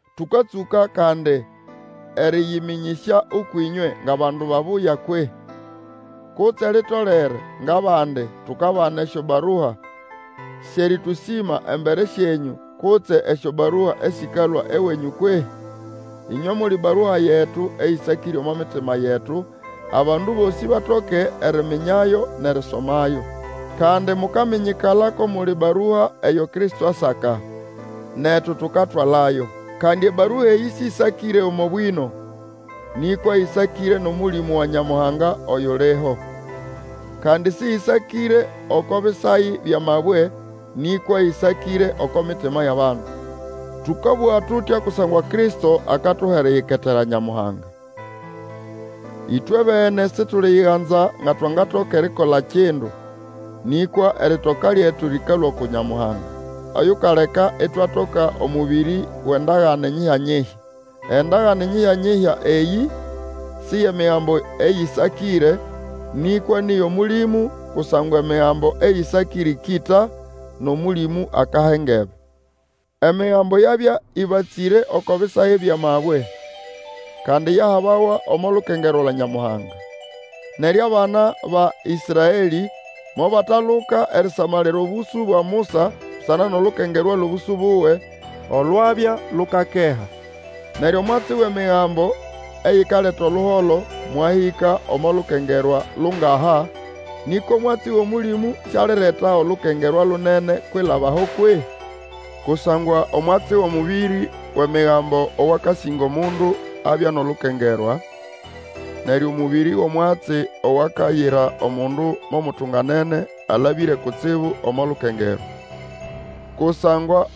Tũkatsũka kandi erĩyĩmĩnyĩsya ũkwʼĩnywe ngʼabandu babuya kwehĩ? Kutse litolere, ngʼabandi, tukabana esyobarua syʼerĩtũsĩma embere syenyũ, kutse esyobarua esĩkalũa ewenyũ kwehĩ? Ĩnywe muli barua yetu, eyĩsakĩre omo mitima yetu, abandu bosĩ batoke eriminyayo nʼerisomayo. Kandi mukaminyikala ko muli barua eyo Kristo asaka, netu tukatwalayo. Kandi ebarua eyĩ sĩsakĩre omo bwĩno, nĩkwa ĩsakĩre nʼOmũlĩmũ wa Nyamuhanga oyuliho. Kandi sĩyĩsakĩre oko bisayi byʼamabwe, nĩkwa ĩsakĩre oko mitima yʼabandu. Tũkabũga tutya kusangwa Kristo akatuha eriyiketera Nyamuhanga. Ĩtwe bene situliyiganza nga twangatoka erikola kindu, nĩkwa eritoka lyetu lĩkalũa uku Nyamuhanga, oyukaleka itwatoka omũbĩrĩ wʼendagane nyihya-nyihya. Endagane nyihya-nyihya eyĩ si yʼemigambo eyĩsakĩre, nĩkwa nĩ yʼOmũlĩmũ, kusangwa emigambo eyĩsakĩre ĩkĩta, nʼOmũlĩmũ akaha engebe. Emigambo yabya ĩbatsĩre oko bisayi byʼamabwe, kandi yahabawa omo lukengerwa lwa Nyamuhanga. Neryo abana ba Ĩsraelĩ mobataluka erisamalira obũsũ bwa Musa busana nʼolukengerwa lyʼobũsũ buwe, olwabya lukakeha. Neryo omwatsi wʼemigambo eyikaleta oluholo mwahĩka omo lukengerwa lungaha, nĩkwa omwatsi wʼOmũlĩmũ sialireta olukengerwa lunene kwilaba aho kwehĩ? Kusangwa omwatsi wʼomũbĩrĩ wʼemigambo owakasĩnga omundu abya nʼolukengerwa, neryo omũbĩrĩ wʼomwatsi owakayira omundu mo mutunganene alabĩre kutsibu omo lukengerwa. Kusangwa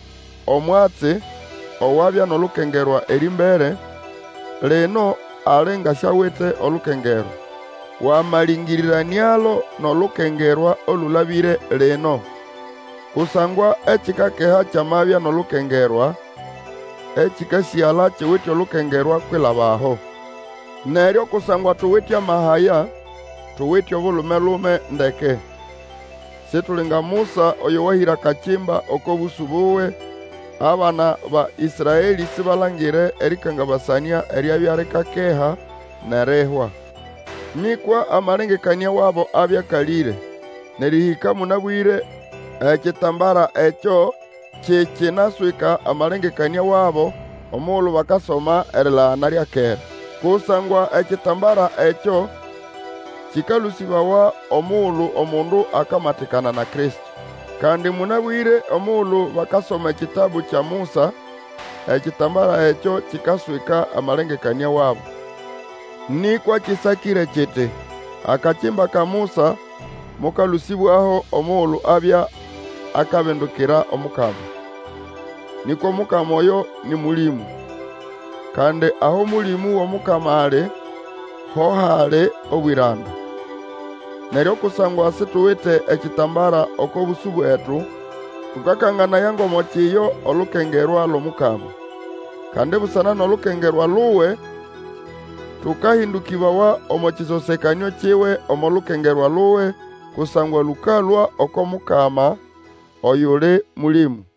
omwatsi owabya nʼolukengerwa erĩmbere, lino ali nga siawite olukengerwa, wamalĩngĩrĩranĩalo nʼolukengerwa olũlabĩre lino. Kusangwa ekikakeha kyamabya nʼolukengerwa, ekĩkasĩgala kiwite olukengerwa kwilaba aho. Neryo kusangwa tuwite amaha aya, tuwite obulume-lume ndeke. Situli nga Musa oyo wahĩra akakimba oko bũsũ buwe, abana ba Ĩsraelĩ sibalangire erĩkangabasanĩa eryabya likakeha, nʼerihwa. Nĩkwa amalengekanĩa wabo abya akalĩre; nʼerĩhĩka mũnabwĩre ekitambara ekyo kikinaswika amalengekanĩa wabo omugulu bakasoma erilagana lya kera. Kusangwa ekitambara ekyo kĩkalũsĩbawa omugulu omundu akamatikana na Kristo. Kandi mũnabwĩre omugulu bakasoma ekitabu kya Musa, ekitambara ekyo kikaswika amalengekanĩa wabo. Nĩkwa kĩsakĩre kiti, Akakimba ka Musa mokalũsĩbwaho omugulu abya akabindukira Omukama. Nĩkwa Omukama oyo nĩ Mũlĩmũ; kandi aho Mũlĩmũ wʼOmukama ali, ho hali obwĩranda. Neryo kusangwa situwite ekitambara oko bũsũ bwetu, tũkakanganaya ngʼomo kiyo olukengerwa lwʼOmukama. Kandi busana nʼolukengerwa luwe tũkahĩndũkĩbawa omo kĩsosekanĩo kiwe omo lukengerwa luwe, kusangwa lũkalũa oko Mukama oyuli Mũlĩmũ.